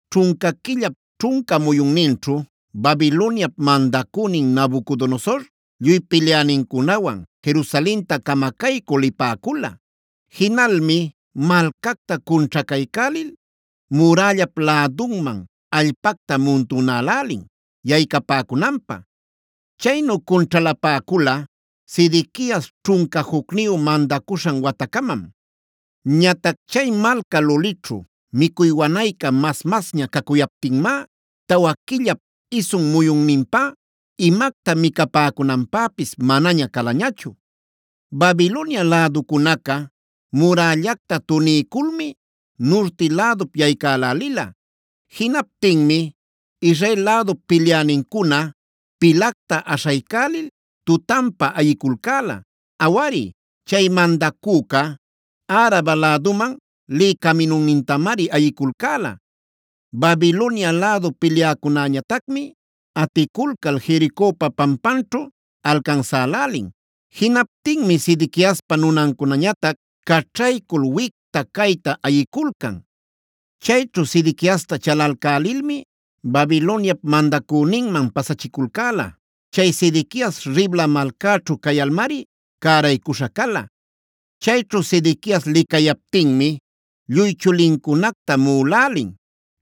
ćhunca quillap ćhunca muyunninćhu Babiloniap mandacünin Nabucodonosor, lluy pilyänincunawan Jerusalenta camacaycü lipäcula. Jinalmi malcacta cunćhacaycälil, murällap lädunman allpacta muntunälälin yaycapäcunanpä. Chaynu cunćhalapäcula Sedequias ćhunca jucniyu mandacuśhan watacamam. Ñatac chay malca lulićhu micuy wanayca mas-masña cacuyaptinmá tawa quillap isun muyunninpá imacta micapäcunanpäpis manaña calañachu. Babilonia läducunaca murällacta tuniyculmi nurti lädup yaycälälila. Jinaptinmi Israel lädup pilyänincuna pilacta aśhaycälil tutanpa ayiculcäla. Awari, chay mandacüca, Araba läduman lï caminunnintamari ayiculcäla. Babilonia lädu pilyäcunäñatacmi aticulcal Jericopa pampanćhu alcansälälin. Jinaptinmi Sedequiaspa nunancunañatac caćhaycul wicta-cayta ayiculcan. Chayćhu Sedequiasta chalalcälilmi Babiloniap mandacüninman pasachiculcäla. Chay Sedequias Ribla malcäćhu cayalmari cäraycuśha cala. Chayćhu Sedequias licayaptinmi lluy chulincunacta muꞌulälin.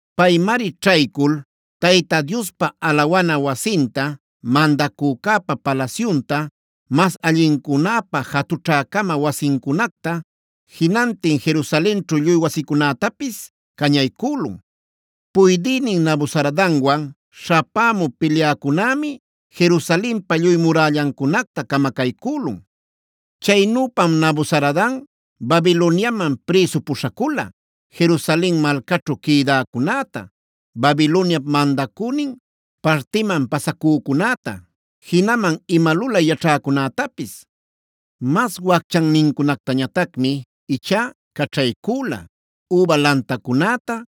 Paymari ćhaycul Tayta Diospa alawana wasinta,c mandacücäpa palasyunta, mas allincunäpa jatućhä-cama wasincunacta, jinantin Jerusalenćhu lluy wasicunätapis cañaycülun. Puydïnin Nabuzaradanwan śhapämü pilyäcunämi, Jerusalenpa lluy murällancunacta camacaycülun. Chaynüpam Nabuzaradan Babiloniaman prïsu puśhacula Jerusalen malcaćhu quïdäcunäta, Babiloniap mandacünin partiman pasacücunäta, jinaman ima lulay yaćhäcunätapis. Mas wacchannincunactañatacmi ichá caćhaycüla üba lantacunäta,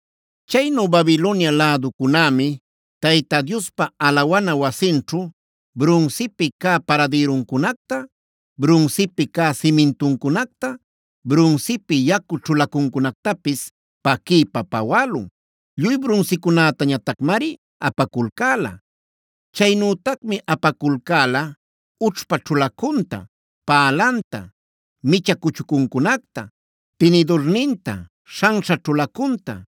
Chaynu Babilonia läducunämi Tayta Diospa alawana wasinćhu brunsipi cä paradïruncunacta,e brunsipi cä simintuncunacta,f brunsipi yacu ćhulacuncunactapis paquiypa pawälun. Lluy brunsicunätañatacmari apaculcäla. Chaynütacmi apaculcäla ućhpa ćhulacunta, pälanta, micha cuchucuncunacta, tinidurninta, śhanśha ćhulacunta,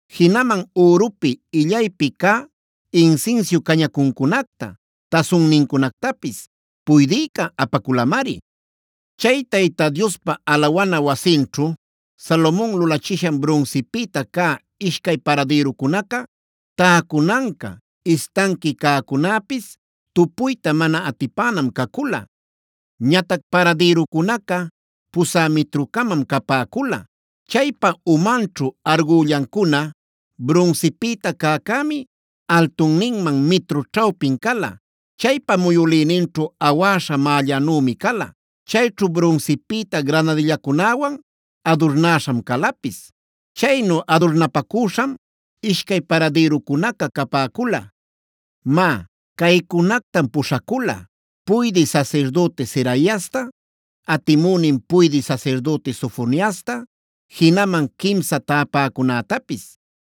Jinaman ürupi, illaypi cä insinsiu cañacuncunacta, tasunnincunactapis puydïca apaculamari. Chay Tayta Diospa alawana wasinćhu Salomon lulachishan brunsipïta cä ishcay paradïrucunaca, täcunanca, istanqui cäcunäpis tupuyta mana atipänam cacula. Ñatac paradïrucunaca pusä mitru-camam capäcula. Chaypa umanćhu argullancuna brunsipïta cäcämi altunninman mitru ćhawpin cala. Chaypa muyülïninćhu awäśha mällanümi cala. Chayćhu brunsipïta granadillacunawan adurnäśham calapis. Chaynu adurnapacüśham ishcay paradïrucunaca capäcula. Má, caycunactam puśhacula: puydï sasirdüti Seraiasta, atimünin puydï sasirdüti Sofoniasta, jinaman quimsan täpäcunätapis.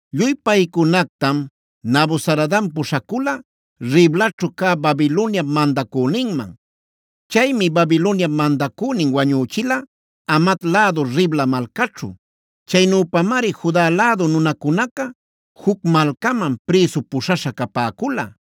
Lluy paycunactam Nabuzaradan puśhacula Riblaćhu cä Babiloniap mandacüninman. Chaymi Babiloniap mandacünin wañüchila, Hamat lädu Ribla malcaćhu. Chaynüpamari Juda lädu nunacunaca juc malcaman prïsu puśhaśha capäcula.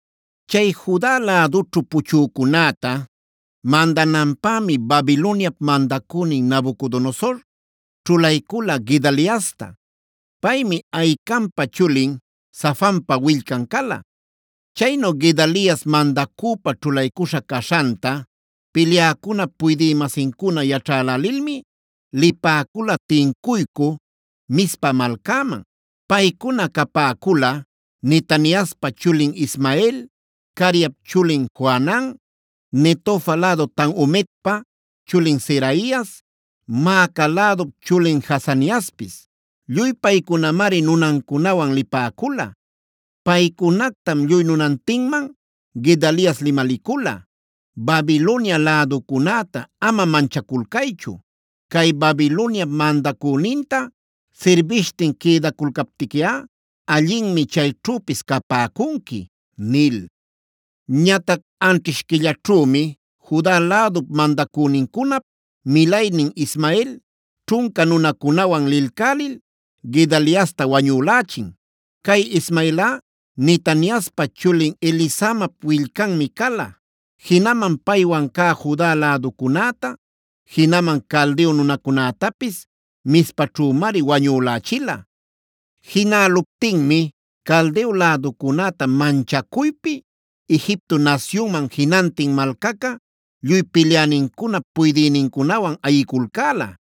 Chay Juda lädućhu puchücunäta mandananpämi Babiloniap mandacünin Nabucodonosor ćhulaycula Gedaliasta. Paymi Ahicampa chulin, Safanpa willcan cala. Chaynu Gedalias mandacüpä ćhulaycuśha caśhanta pilyäcunap puydï-masincuna yaćhälälilmi, lipäcula tincuycü Mizpa malcäman. Paycuna capäcula: Netaniaspa chulin Ismael, Careap chulin Johanan, Netofa lädu Tanhumetpa chulin Seraias, Maaca lädup chulin Jaazaniaspis. Lluy paycunamari nunancunawan lipäcula. Paycunactam lluy nunantinman Gedalias limalicula: “Babilonia läducunäta ama manchaculcaychu. Cay Babiloniap mandacüninta sirbishtin quïdaculcaptiquiꞌa, allinmi chayćhüpis capäcunqui” nil. Ñatac anćhish quillaćhümi Juda lädup mandacünincunap milaynin Ismael, ćhunca nunacunawan lilcälil Gedaliasta wañülächin. Cay Ismaelꞌa Netaniaspa chulin, Elisamap willcanmi cala. Jinaman paywan cä Juda läducunäta, jinaman Caldeo nunacunätapis Mizpaćhümari wañülächila. Jinäluptinmi Caldeo läducunäta manchacuypi Egipto nasyunman jinantin malcaca lluy pilyänincunap puydïnincunawan ayiculcäla.h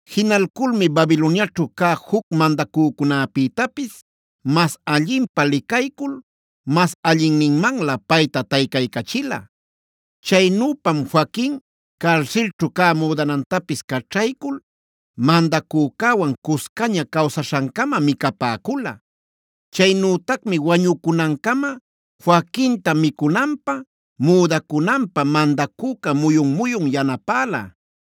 Jinalculmi Babiloniaćhu cä juc mandacücunäpïtapis mas allinpä licaycul mas allinmanlä payta taycaycachila. Chaynüpam Joaquin carsilćhu cä müdanantapis caćhaycul, mandacücäwan cuscaña cawsaśhancama micapäcula. Chaynütacmi wañucunancama Joaquinta micunanpä, müdacunanpä mandacüca muyun-muyun yanapäla.